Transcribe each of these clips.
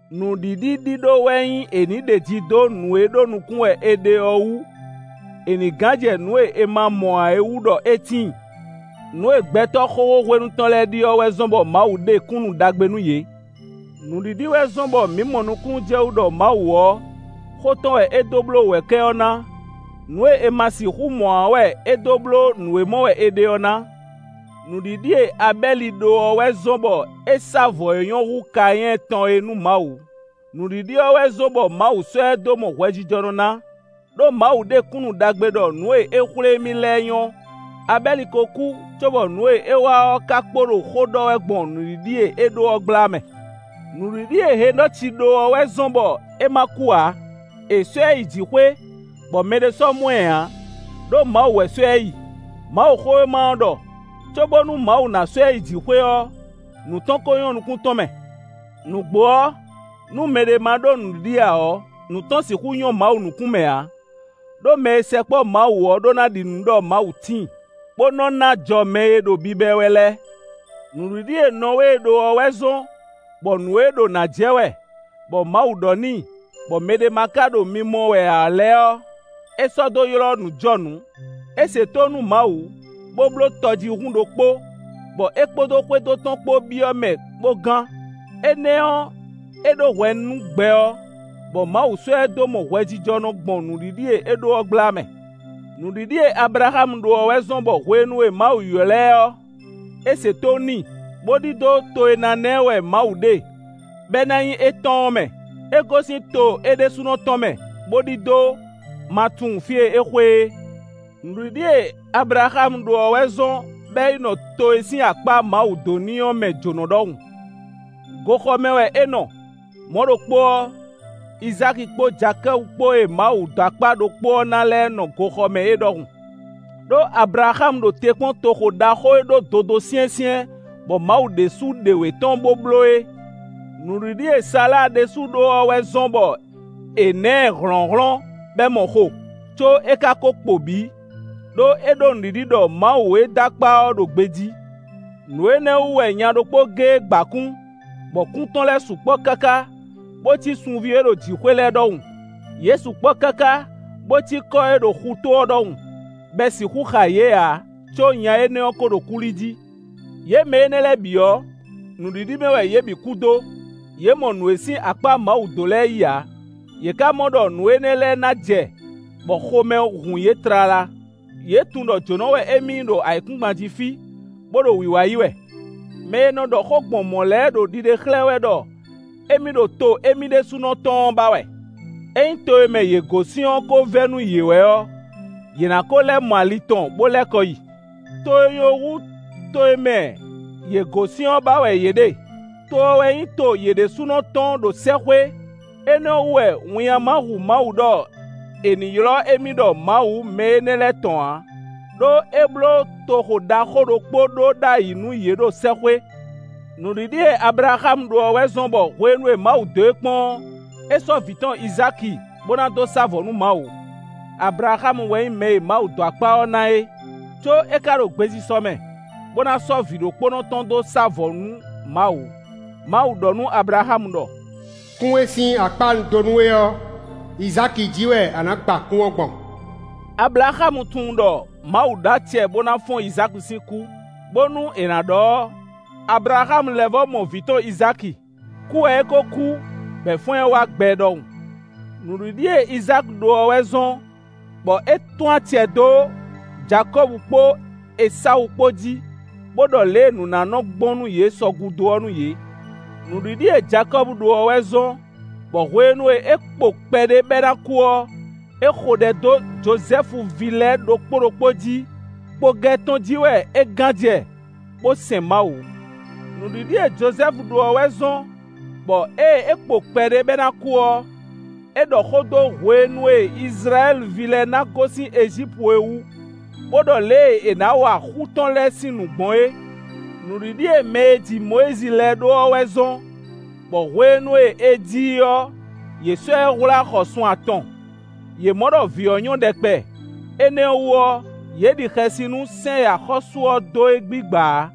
Nǔɖiɖi ɖíɖó wɛ nyí è nǐ ɖeji dó nǔ e ɖó nukún wɛ è ɖe ɔ́ wú; è nǐ gán jɛ nǔ e è ma mɔ ǎ é wú ɖɔ é tíin. Nǔ e gbɛtɔ́ xóxó hwenu tɔn lɛ́ɛ ɖi ɔ́ wɛ zɔ́n bɔ Mawu ɖe kúnnu ɖagbe nú yě. Nǔɖiɖi wɛ zɔ́n bɔ mǐ mɔ nukúnnú jɛ wú ɖɔ Mawu ɔ́, xó tɔn wɛ é dó bló wɛ̌kɛ́ ɔ́ ná; nǔ e è ma sixú mɔ ǎ ɔ́ wɛ é dó bló nǔ e mɔ wɛ è ɖe ɔ́ ná. Nǔɖiɖi e Abɛ́li ɖó ɔ́ wɛ zɔ́n bɔ é sá vɔ̌ e nyɔ́ hú Kanyɛ́ɛ tɔn é nú Mawu. Nǔɖiɖi ɔ́ wɛ zɔ́n bɔ Mawu sɔ́ ɛ dó mɔ hwɛjijɔnɔ ná, ɖó Mawu ɖe kúnnu ɖagbe ɖɔ nǔ e é xwlé émí lɛ́ɛ nyɔ́. Abɛ́li ko kú cóbɔ nǔ e é wa ɔ́ ka kpo ɖo xó ɖɔ wɛ gbɔn nǔɖiɖi e é ɖó ɔ́ gbla mɛ. Nǔɖiɖi e Henɔci ɖó ɔ́ wɛ zɔ́n bɔ é ma kú ǎ. È sɔ́ ɛ yi jǐxwé, bɔ mɛɖé sɔ́ mɔ ɛ ǎ; ɖó Mawu wɛ sɔ́ ɛ yi. Mawuxówéma ɔ́ ɖɔ: cóbónú Mawu ná sɔ́ ɛ yi jǐxwé ɔ́, nǔ tɔn ko nyɔ́ nukún tɔn mɛ. Nǔgbó ɔ́, nú mɛɖé ma ɖó nǔɖiɖi ǎ ɔ́, nǔ tɔn sixú nyɔ́ Mawu nukún mɛ ǎ; ɖó mɛ e sɛkpɔ́ Mawu ɔ́ ɖó ná ɖi nǔ ɖɔ Mawu tíin, bó nɔ ná ajɔ mɛ e ɖo biba ɛ wɛ lɛ́ɛ. Nǔɖiɖi e Nɔwée ɖó ɔ́ wɛ zɔ́n bɔ nǔ e ɖo nǎ jɛ wɛ, bɔ Mawu ɖɔ n'i, bɔ mɛɖé ma ka ɖo mimɔ wɛ ǎ lɛ́ɛ ɔ́, é sɔ́ dó ylɔ́ nǔjɔnǔ. É se tónú nú Mawu, bó bló tɔjíhún ɖokpó, bɔ é kpódó xwédo tɔn kpó byɔ́ mɛ bó gán. Énɛ́ ɔ́, é ɖó hwɛ nú gbɛ ɔ́, bɔ Mawu sɔ́ ɛ dó mɔ hwɛjijɔnɔ gbɔn nǔɖiɖi e é ɖó ɔ́ gbla mɛ. Nǔɖiɖi e Ablaxámu ɖó ɔ́ wɛ zɔ́n bɔ hwenu e Mawu ylɔ̌ ɛ ɔ́, é se tónú n'i, bó ɖidó to e ná ná ɛ wɛ Mawu ɖe, bɔ é ná nyí étɔn ɔ́ mɛ. É gosín to é ɖésúnɔ tɔn mɛ, bó ɖidó, ma tunwun fí e é xwe é. Nǔɖiɖi e Ablaxámu ɖó ɔ́ wɛ zɔ́n bɔ é yi nɔ to e sín akpá Mawu dó n'i ɔ́ mɛ jǒnɔ ɖɔhun; goxɔ mɛ wɛ é nɔ; mɔ̌ ɖokpó ɔ́, Izáki kpó Jakɔ́bu kpó e Mawu dó akpá ɖokpó ɔ́ ná lɛ́ɛ nɔ goxɔ mɛ é ɖɔhun. Đó Ablaxámu ɖo te kpɔ́n toxo ɖaxó e ɖó dodó syɛ́nsyɛ́n, bɔ Mawu ɖésú ɖe wě tɔn bó bló é. Nǔɖiɖi e Sala ɖésú ɖó ɔ́ wɛ zɔ́n bɔ è nǎ ɛ hlɔ̌nhlɔ́n bɔ é mɔ xo, có é ka ko kpo bǐ, ɖó é ɖó nǔɖiɖi ɖɔ Mawu e dó akpá ɔ́ ɖo gbejí. Nǔ énɛ́ wú wɛ nya ɖokpó géé gba kún, bɔ kún tɔn lɛ́ɛ sukpɔ́ káká, bó cí sunví e ɖo jǐxwé lɛ́ɛ ɖɔhun; yě sukpɔ́ káká bo cí kɔ́ e ɖo xutó ɔ́ ɖɔhun, bɔ è sixú xa yě ǎ; có nya énɛ́ ɔ́ ko ɖo kú li jí. Yě mɛ énɛ́ lɛ́ɛ bǐ ɔ́, nǔɖiɖi mɛ wɛ yě bǐ kú dó. Yě mɔ nǔ e sín akpá Mawu dó lɛ́ɛ yí ǎ; yě ka mɔ ɖɔ nǔ énɛ́ lɛ́ɛ ná jɛ bɔ xomɛ hun yě tlala. Yě tunwun ɖɔ jǒnɔ wɛ émí nyí ɖo ayǐkúngban jí fí, bó ɖo wiwa yi wɛ. Mɛ e nɔ ɖɔ xó gbɔn mɔ̌ lɛ́ɛ ɖo ɖiɖe xlɛ́ wɛ ɖɔ émí ɖo to émí ɖésúnɔ tɔn ɔ́ ba wɛ. Ényí to e mɛ yě gosín ɔ́ ko vɛ́ nú yě wɛ ɔ́, yě ná ko lɛ́ mɔ ali tɔn bó lɛ́ kɔ yi. To e nyɔ́ hú to e mɛ yě gosín ɔ́ ba wɛ yě ɖe; to ɔ́ wɛ nyí to yě ɖésúnɔ tɔn ɖo sɛ́xwé. Énɛ́ ɔ́ wú wɛ winnyá ma hu Mawu ɖɔ è nǐ ylɔ́ émí ɖɔ Mawu mɛ énɛ́ lɛ́ɛ tɔn ǎ; ɖó é bló toxo ɖaxó ɖokpó ɖó ɖ'ayǐ nú yě ɖo sɛ́xwé. Nǔɖiɖi e Ablaxámu ɖó ɔ́ wɛ zɔ́n bɔ hwenu e Mawu dó e kpɔ́n ɔ́, é sɔ́ vǐ tɔn Izáki bó ná dó sá vɔ̌ nú Mawu. Ablaxámu wɛ nyí mɛ e Mawu dó akpá ɔ́ ná é; có é ka ɖo gbesisɔ mɛ bó ná sɔ́ vǐ ɖokpónɔ tɔn dó sá vɔ̌ nú Mawu. Mawu ɖɔ nú Ablaxámu ɖɔ: “Kún e sín akpá un dó nú we ɔ́, Izáki jí wɛ a nǎ gba kún ɔ́ gbɔn.” Ablaxámu tunwun ɖɔ Mawu ɖó acɛ bó ná fɔ́n Izáki sín kú. Bónú è nǎ ɖɔ ɔ́, Ablaxámu lɛ́ vɔ́ mɔ vǐ tɔn Izáki kú wɛ é ko kú, bɔ è fɔ́n ɛ wá gbɛ ɖɔhun. Nǔɖiɖi e Izáki ɖó ɔ́ wɛ zɔ́n bɔ é tún acɛ dó Jakɔ́bu kpó Esawu kpó jí, bó ɖɔ lě e nǔ ná nɔ gbɔn nú yě sɔ gúdo ɔ́ nú yě. Nǔɖiɖi e Jakɔ́bu ɖó ɔ́ wɛ zɔ́n bɔ hwenu e é kpo kpɛɖé bɔ é ná kú ɔ́, é xo ɖɛ dó Jozɛ́fu ví lɛ́ɛ ɖokpó ɖokpó jí; kpogɛ tɔn jí wɛ é gán jɛ bó sɛn Mawu. Nǔɖiɖi e Jozɛ́fu ɖó ɔ́ wɛ zɔ́n bɔ ée é kpo kpɛɖé bɔ é ná kú ɔ́, é ɖɔ xó dó hwenu e Izlayɛ́li ví lɛ́ɛ ná gosín Ejípu é wú, bó ɖɔ lě e è nǎ wa xú tɔn lɛ́ɛ sín nǔ gbɔn é. Nǔɖiɖi e mɛ e ji Mɔyízi lɛ́ɛ ɖó ɔ́ wɛ zɔ́n bɔ hwenu e è ji i ɔ́, yě sɔ́ ɛ hwlá xɔ sun atɔn. Yě mɔ ɖɔ vǐ ɔ́ nyɔ́ ɖɛkpɛ; énɛ́ ɔ́ wú ɔ́, yě ɖi xɛsi nú sɛ́n e axɔ́sú ɔ́ dó é gbigba ǎ.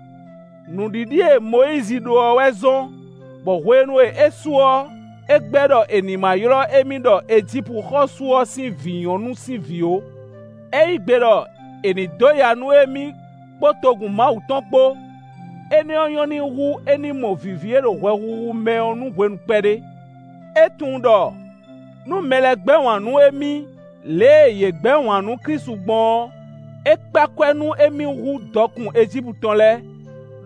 Nǔɖiɖi e Mɔyízi ɖó ɔ́ wɛ zɔ́n bɔ hwenu e é su ɔ́, é gbɛ́ ɖɔ è nǐ ma ylɔ́ émí ɖɔ Ejípu xɔ́sú ɔ́ sín vǐ nyɔ̌nu sín vǐ ó. É yí gbe ɖɔ è nǐ dó ya nú émí kpó togun Mawu tɔn kpó; énɛ́ ɔ́ nyɔ́ n'i hú é ní mɔ vǐví e ɖo hwɛhuhu mɛ ɔ́ nú hwenu kpɛɖé. É tunwun ɖɔ nú mɛ lɛ́ɛ gbɛ́ wǎn nú émí lě e yě gbɛ́ wǎn nú Klísu gbɔn ɔ́, é kpé akwɛ́ nú émí hú dɔkun Ejípu tɔn lɛ́ɛ;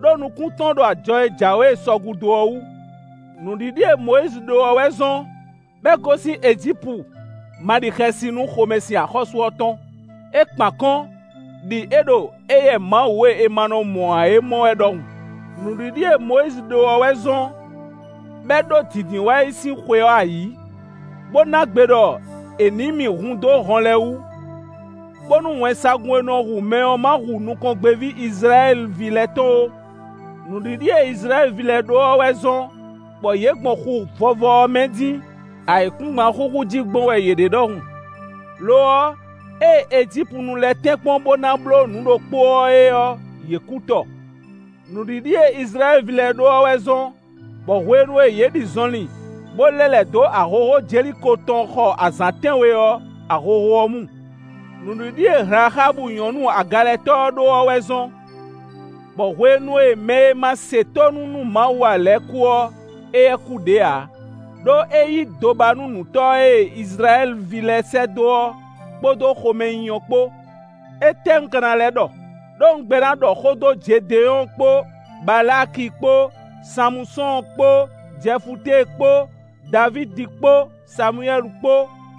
ɖó nukún tɔn ɖo ajɔ e jǎwe sɔ gúdo ɔ́ wú. Nǔɖiɖi e Mɔyízi ɖó ɔ́ wɛ zɔ́n bɔ é gosín Ejípu ma ɖi xɛsi nú xomɛsin axɔ́sú ɔ́ tɔn. É kpán akɔ́n, ɖi é ɖo éyɛ́ Mawu e è ma nɔ mɔ ǎ é mɔ wɛ ɖɔhun. Nǔɖiɖi e Mɔyízi ɖó ɔ́ wɛ zɔ́n bɔ é ɖó Dǐndínwáyi sín xwe ɔ́ ayǐ, bó ná gbe ɖɔ è nǐ mì hun dó hɔn lɛ́ɛ wú, bónú wɛnsagun e nɔ hu mɛ ɔ́ ma hu nukɔngbéví Izlayɛ́li ví lɛ́ɛ tɔn ó. Nǔɖiɖi e Izlayɛ́li ví lɛ́ɛ ɖó ɔ́ wɛ zɔ́n bɔ yě gbɔn Xu Vɔvɔ ɔ́ mɛ dín, ayǐkúngban xúxú jí gbɔn wɛ yě ɖe ɖɔhun. Lo ɔ́, ée Ejípunu lɛ́ɛ tɛ́nkpɔ́n bó ná bló nǔ ɖokpó ɔ́ é ɔ́, yě kú tɔ. Nǔɖiɖi e Izlayɛ́li ví lɛ́ɛ ɖó ɔ́ wɛ zɔ́n bɔ hwenu e yě ɖi zɔnlin, bó lɛ́ lɛ̌ dó ahohó Jeliko tɔn xɔ azǎn tɛ́nwe ɔ́, ahohó ɔ́ mu. Nǔɖiɖi e Hlaxábu nyɔ̌nu agalɛtɔ́ ɔ́ ɖó ɔ́ wɛ zɔ́n bɔ hwenu e mɛ e ma se tónú nú Mawu ǎ lɛ́ɛ kú ɔ́, éyɛ́ kú ɖě ǎ, ɖó é yí dobanúnǔtɔ́ e Izlayɛ́li ví lɛ́ɛ sɛ́ dó ɔ́, kpódó xomɛnyínyɔ́ kpó. Étɛ́ un ka ná lɛ́ ɖɔ? Đó un gbɛ́ ná ɖɔ xó dó Jedenyɔ́ɔ kpó Balaaki kpó, Sanmusɔ́ɔn kpó Jɛfutée kpó, Davídi kpó Samuwɛ́li kpó,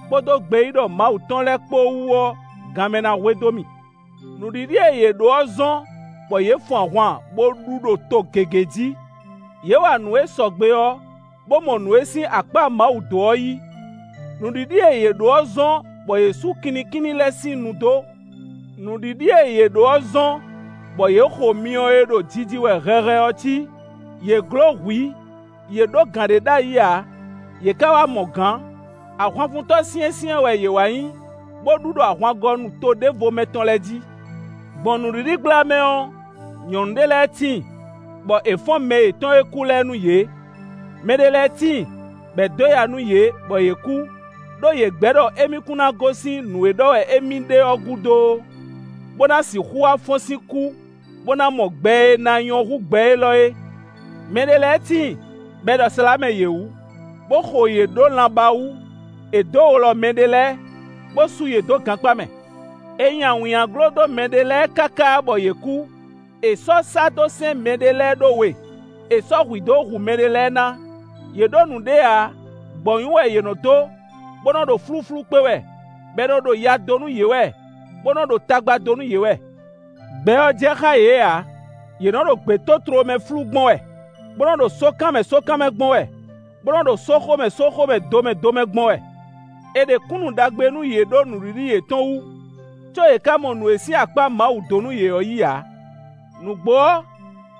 kpódó gbeyíɖɔ Mawu tɔn lɛ́ɛ kpó wú ɔ́, ganmɛ ná hwedó mì. Nǔɖiɖi e yě ɖó ɔ́ zɔ́n bɔ yě fun ahwan, bó ɖu ɖo to gěgé jí; yě wa nǔ e sɔgbe ɔ́, bó mɔ nǔ e sín akpá Mawu dó ɔ́ yí. Nǔɖiɖi e yě ɖó ɔ́ zɔ́n bɔ yě sú kinnikínní lɛ́ɛ sín nu dó. Nǔɖiɖi e yě ɖó ɔ́ zɔ́n bɔ yě xo myɔ e ɖo jiji wɛ hɛhɛ ɔ́ cí; yě gló hwǐ; yě ɖó gǎn ɖé ɖ'ayǐ ǎ, yě ka wá mɔ gǎn. Ahwanfuntɔ́ syɛ́nsyɛ́n wɛ yě wá nyí, bó ɖu ɖo ahwangɔnu to ɖěvo mɛ tɔn lɛ́ɛ jí. Gbɔn nǔɖiɖi gbla mɛ ɔ́, nyɔ̌nu ɖé lɛ́ɛ tíin, bɔ è fɔ́n mɛ yětɔn e kú lɛ́ɛ nú yě. Mɛ ɖé lɛ́ɛ tíin, bɔ è dó ya nú yě, bɔ yě kú, ɖó yě gbɛ́ ɖɔ émí kún ná gosín nǔ e ɖɔ wɛ émí ɖe ɔ́ gúdo ó, bó ná sixú wá fɔ́n sín kú, bó ná mɔ gbɛ e ná nyɔ́ hú gbɛ élɔ́ é. Mɛ ɖé lɛ́ɛ tíin, bɔ è ɖɔ slǎmɛ yě wú, bó xo yě ɖó lanbá wú; è dǒ wlɔ mɛɖé lɛ́ɛ, bó sú yě dó gankpá mɛ. È nyi awǐnnyaglo dó mɛɖé lɛ́ɛ káká bɔ yě kú; è sɔ́ sá dó sɛ́n mɛɖé lɛ́ɛ ɖó we; è sɔ́ hwǐ dó hu mɛɖé lɛ́ɛ ná. Yě ɖó nǔɖé ǎ; gbɔ̌nyú wɛ yě nɔ dó, bó nɔ ɖo flúflú kpé wɛ, bɔ è nɔ ɖo ya dó nú yě wɛ, bó nɔ ɖo tagba dó nú yě wɛ. Gbɛ ɔ́ jɛ xá yě ǎ; yě nɔ ɖo gbětótló mɛ flú gbɔn wɛ, bó nɔ ɖo sókan mɛ sókan mɛ gbɔn wɛ, bó nɔ ɖo sóxo mɛ sóxo mɛ, do mɛ do mɛ gbɔn wɛ. È ɖe kúnnu ɖagbe nú yě ɖó nǔɖiɖi yětɔn wú; có yě ka mɔ nǔ e sín akpá Mawu dó nú yě ɔ́ yí ǎ. Nǔgbó ɔ́,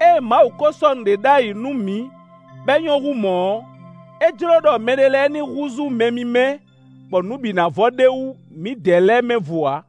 ée Mawu ko sɔ́ nǔɖé ɖ'ayǐ nú mǐ bɔ é nyɔ́ hú mɔ̌ ɔ́, é jló ɖɔ mɛ énɛ́ lɛ́ɛ ní húzú mɛ mímɛ́ bɔ nǔ bǐ ná vɔ ɖ'é wú mǐdɛɛ lɛ́ɛ mɛ vo ǎ.